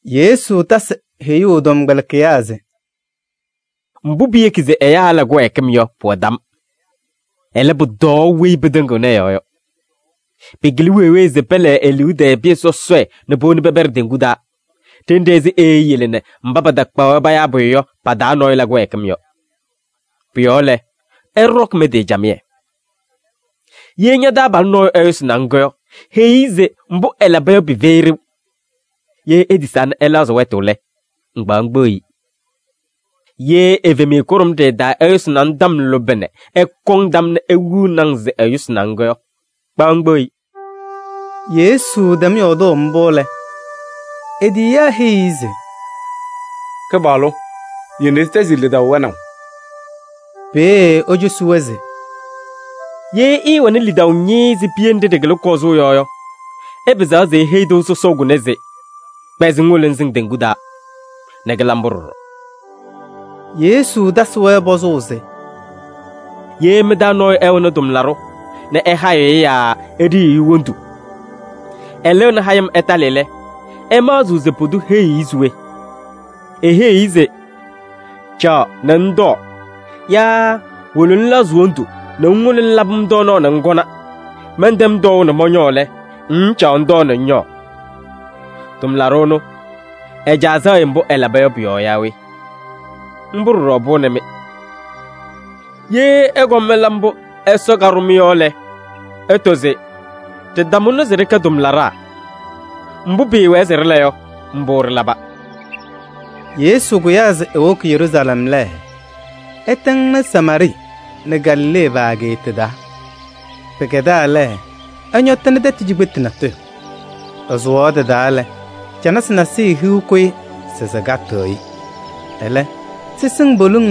Yesu tasɩ heyuu ɛ-tɔmkpɛlɩkɩyaa se: “Mbʋ piyeki se ɛyaa ɛla kɩwɛɛkɩm yɔ, pʋwɛ tam. Ɛlɛ, pʋtɔɔ weyi pɩtɩŋɩɣnɩ ɛ-yɔɔ yɔ. Pɩkɩlɩ wee wee se pɛlɛɛ e-liu tɛɛ pɩyɛ sɔsɔɖɛ nɛ powoni pɛpɛɖɩ teŋgu taa ɖenɖe ɛzɩ eeyele nɛ mba patakpaɣ-wɛ payaa pʋyʋ yɔ pa-taa nɔɔyʋ la kɩwɛɛkɩm yɔ. Pʋ-yɔɔ lɛ, ɩɖɔkɩ mɩ-tɩ camɩyɛ! Ye ña-taabalʋ nɔɔyʋ ɛyʋsɩnɩ-ŋ yɔ, heyi-i se mbʋ ɛlaba yɔ pɩfɛyɩ ɖeu. Ye etisaa nɛ ɛlɛɣzɩ wɛtʋ lɛ, ŋkpaɣ ŋkpeɣ-i. Ye evemiye kʋɖʋmɖɩyɛ taa ɛyʋsɩnɩ-ŋ tɔm lʋbɛ nɛ ɛkɔŋ tam nɛ ewiɣni-ŋ se ɛyʋsɩnɩ-ŋ yɔ, kpaɣ ŋkpeɣ-i.” Yesu tɛm yɔɔdʋʋ mbʋ lɛ, e-tiyiyaa heyi-i se: “Kɩpaɣlʋ! Yele nɛ ɖɩtɛzɩ lidaʋ wɛnaʋ.” Peeye ecosi-wɛ se: “Ye ɩɩwɛnɩ lidaʋ ñɩɩɩ ɛzɩ piye nɖɩ ɖɩkɩlɩ kɔzʋʋ yɔ yɔ, ɩpɩzaɣ se iheyi tɩʋ sɔsɔʋ kʋnɛ se: ‘Kpɛzɩ ŋwolo ŋsɩŋ teŋgu taa!’ Nɛ kɩla mbʋ ɖɔɖɔ.” Yesu tasɩ-wɛ pɔzʋʋ se: “Ye mɩ-taa nɔɔyʋ ɛwɛnɩ tʋmlaɖʋ nɛ ɛhayɩɣ-ɩ yaa eɖiyiɣ-i wondu, ɛlɩɣnɩ hayɩm ɛtalɩ lɛ, ɩmaɣzɩɣ se pʋdʋ heyiɣ-i se we? Eheyiɣ-i se: ‘Caɣ nɛ ŋtɔɔ’ yaa ‘Wolo ŋlɛɣzɩ wondu nɛ ŋwolo ŋlabɩ-m tɔɔnaɣ nɛ ŋkɔna. Mɛntɛm tɔɔʋ nɛ mɔñɔɔ lɛ, ŋŋcaɣ ŋtɔɔ nɛ ŋñɔɔ?’ Tʋmlaɖʋ ɛnʋ, ɛ-caa sɛɣ-ɩ mbʋ ɛlaba yɔ pʋ-yɔɔ yaa we? Mbʋ ɖɔɖɔ pʋwɛnɩ-mɩ. Ye ɩkɔm ɩla mbʋ Ɛsɔ kaɖʋ-mɩ yɔ lɛ, ɩtɔ se: ‘Ɖɩtamʋnɩ se ɖɩkɛ tʋmlaɖaa. Mbʋ pɩɩwɛɛ se ɖɩla yɔ, mbʋ ɖɩlaba.’” Yesu kʋyaa se ewoki Yeruusalɛm lɛ, ɛtɩŋnɩ Samaarɩɩ nɛ Galilee pa-ageeta taa. Pɩkɛdaa lɛ, ɛñɔtɩnɩ tɛtʋ cikpetu natʋyʋ. Ɛsʋwaɣ tɩ-taa lɛ, canasɩ nasɩyɩ hiu kʋyɩ se sɩkatɩɣ-ɩ. Ɛlɛ sɩsɩŋ poliŋ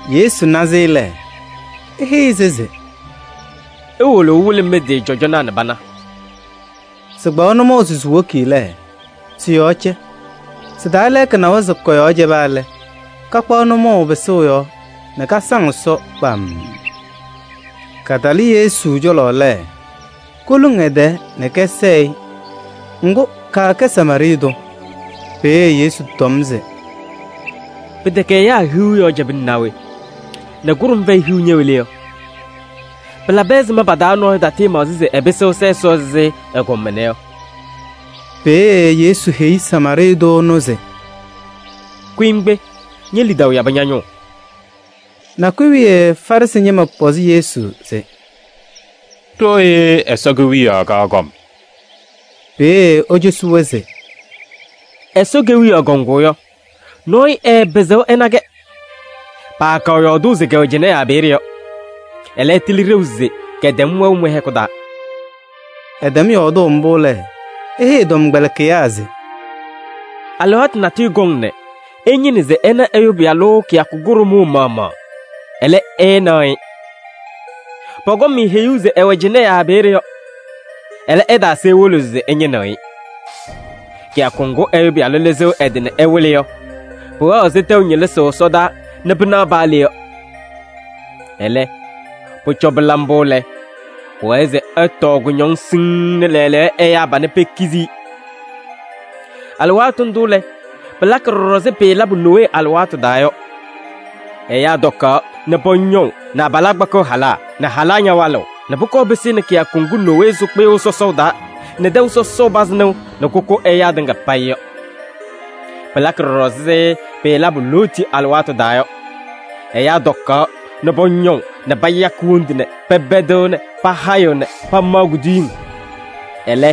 Yesu na-sɩ lɛ, eheyi-sɩ se: “Iwolo ɩwɩlɩ mɩ-tɩ cɔjɔnaa nɛ pana.” Sɩkpaɣ nʋmɔʋ se siwoki lɛ, sɩ-yɔɔ cɛ. Sɩ-taa lɛɛka nawa se kɔ-yɔɔ cɛba lɛ, kakpaɣ nʋmɔʋ pɩsʋʋ yɔɔ nɛ kasaŋ Ɛsɔ kpamm. Katalɩ Yesu cɔlɔ lɛ, koluŋ ɛ-tɛɛ nɛ kɛsɛɛ-ɩ. Ŋgʋ, kaakɛ Samaarɩɩ tʋ. Peeye Yesu tɔm se: “Pɩtɛkɛ ɛyaa hiu yɔɔ cɛbɩna naa we? Nɛ kʋɖʋm fɛyɩ hiu ñɛwɛ le yɔ? Pɩlabɩ ɛzɩma pa-taa nɔɔyʋ tatɩɩmaɣzɩ se ɛpɩsɩɣ ɛsa Ɛsɔ ɛzɩ ɛgɔm ɛnɛ yɔ?” Peeye Yesu heyi Samaarɩɩ tʋ ɛnʋ se: “Kʋyɩ ŋkpe, ñe-lidaʋ yabɩ ña-nʋʋ.” Nakʋyʋ wiye Farɩsɩ ñɩma pɔzɩ Yesu se: “Ɖooye Ɛsɔ Kewiyaɣ kaɣ kɔm” Peeye ecosi-wɛ se: “Ɛsɔ Kewiyaɣ kɔŋʋʋ yɔ, nɔɔyʋ ɛɛpɩzɩɣ ɛna-kɛ. Paakaɣ yɔɔdʋʋ se kɛwɛ cɩnɛ yaa peeye yɔ. Ɛlɛ, ɩtɩlɩ ɖeu se kɛtɛm wɛʋ mɩ-hɛkʋ taa.” Ɛtɛm yɔɔdʋʋ mbʋ lɛ, eheyi ɛ-tɔmkpɛlɩkɩyaa se: “Alɩwaatʋ natʋyʋ kɔŋ nɛ ɩñɩnɩ se ɩna Ɛyʋ Pɩyalʋ kɩyakʋ kʋɖʋmʋʋ maɣmaɣ, ɛlɛ, ɩɩnaɣ-ɩ. Pɔkɔŋ-mɩ heyuu se ɛwɛ cɩnɛ yaa peeye yɔ. Ɛlɛ, ɩtaase iwolo se ɩñɩnɩɣ-ɩ. Kɩyakʋ ŋgʋ Ɛyʋ Pɩyalʋ lɩzɩɣ ɛ-tɩ nɛ ɛwɩlɩ yɔ, pʋwɛɣ ɛzɩ tɛʋ ñɩlɩsʋʋ ɛsɔdaa nɛ pɩnaɣ paa le yɔ. Ɛlɛ, pʋcɔ pɩla mbʋ lɛ, pʋwɛɛ se ɛtɔɔ kʋñɔŋ siŋŋ nɛ lɛɛlɛɛyɔ ɛyaa panɛ pekizi-i. Alɩwaatʋ ndʋ lɛ, pɩlakɩ ɖɔɖɔ ɛzɩ pɩɩlabʋ Nowee alɩwaatʋ taa yɔ: ɛyaa tɔkaɣ nɛ pɔñɔʋ nɛ abalaa kpakɩɣ halaa nɛ halaa ñawalɩɣ nɛ pʋkɔɔ pɩsɩnɩ kɩyakʋ ŋgʋ Nowee sʋ kpɩyʋʋ sɔsɔʋ taa nɛ tɛʋ sɔsɔʋ pazɩ nɩʋ nɛ kʋkʋ ɛyaa tɩŋa payɩ yɔ. Pɩlakɩ ɖɔɖɔ ɛzɩ pɩɩlabʋ Looti alɩwaatʋ taa yɔ: ɛyaa tɔkaɣ nɛ pɔñɔʋ nɛ payakɩ wondu nɛ pɛpɛdɩɣ nɛ pahayɩɣ nɛ pamaɣ kuduyiŋ. Ɛlɛ,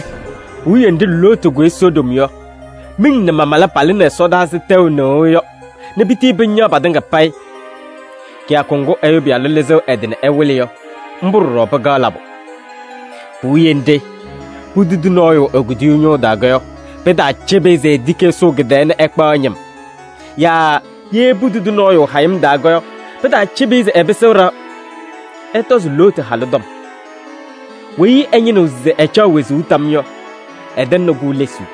puwiye nɖɩ Looti kʋyɩ Sodom yɔ, miŋ nɛ mamala palɩnɩ ɛsɔdaa ɛzɩ tɛʋ nɩɣʋ yɔ nɛ pitii pɩñaɣ patɩŋa payɩ. Kɩyakʋ ŋgʋ Ɛyʋ Pɩyalʋ lɩzɩɣ ɛ-tɩ nɛ ɛwɩlɩ yɔ, mbʋ ɖɔɖɔ pɩkaɣ labʋ. Puwiye nɖɩ, putudi nɔɔyʋ e-kuduyuu ñʋʋ taa yɔ, pɩtaacɩbɩ-ɩ se etiki ɛsʋʋ kɩ-tɛɛ nɛ ɛkpaɣ ɛ-ñɩm. Yaa ye putudi nɔɔyʋ hayɩm taa yɔ, pɩtaacɩbɩ-ɩ se ɛpɩsɩɣ ɖɩɣa. Ɩtɔzɩ Looti halʋ tɔm. Weyi ɛñɩnɩɣ se ɛcaɣ wezuu tam yɔ, ɛtɛŋnɩ-kʋ lesuu.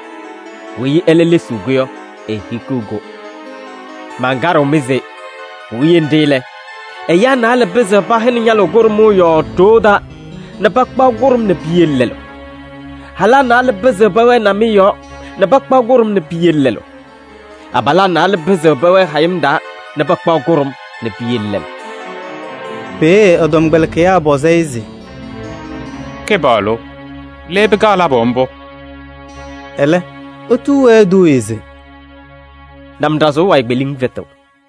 Weyi ɛlɛ lesiɣ-kʋ yɔ, ehikiɣ-kʋ. Mankaɖɩɣ-mɩ se: puwiye nɖɩ lɛ, ɛyaa naalɛ pɩzɩɣ pɛhɛnɩ ñalʋʋ kʋɖʋmʋʋ yɔɔ ɖoo taa nɛ pakpaɣ kʋɖʋm nɛ piyele lɛlʋ. Halaa naalɛ pɩzɩɣ pɛwɛɛ namɩyɛ yɔɔ nɛ pakpaɣ kʋɖʋm nɛ piyele lɛlʋ. [ Abalaa naalɛ pɩzɩɣ pɛwɛɛ hayɩm taa nɛ pakpaɣ kʋɖʋm nɛ piyele lɛlʋ.”] Peeye ɛ-tɔmkpɛlɩkɩyaa pɔzɩ-ɩ se: “Kɩpaɣlʋ! Le pɩkaɣ labʋ mbʋ?” Ɛlɛ etuu-wɛ eduuye se: “Namɖazʋʋ wayɩ kpeliŋ fɛtɩɣ.”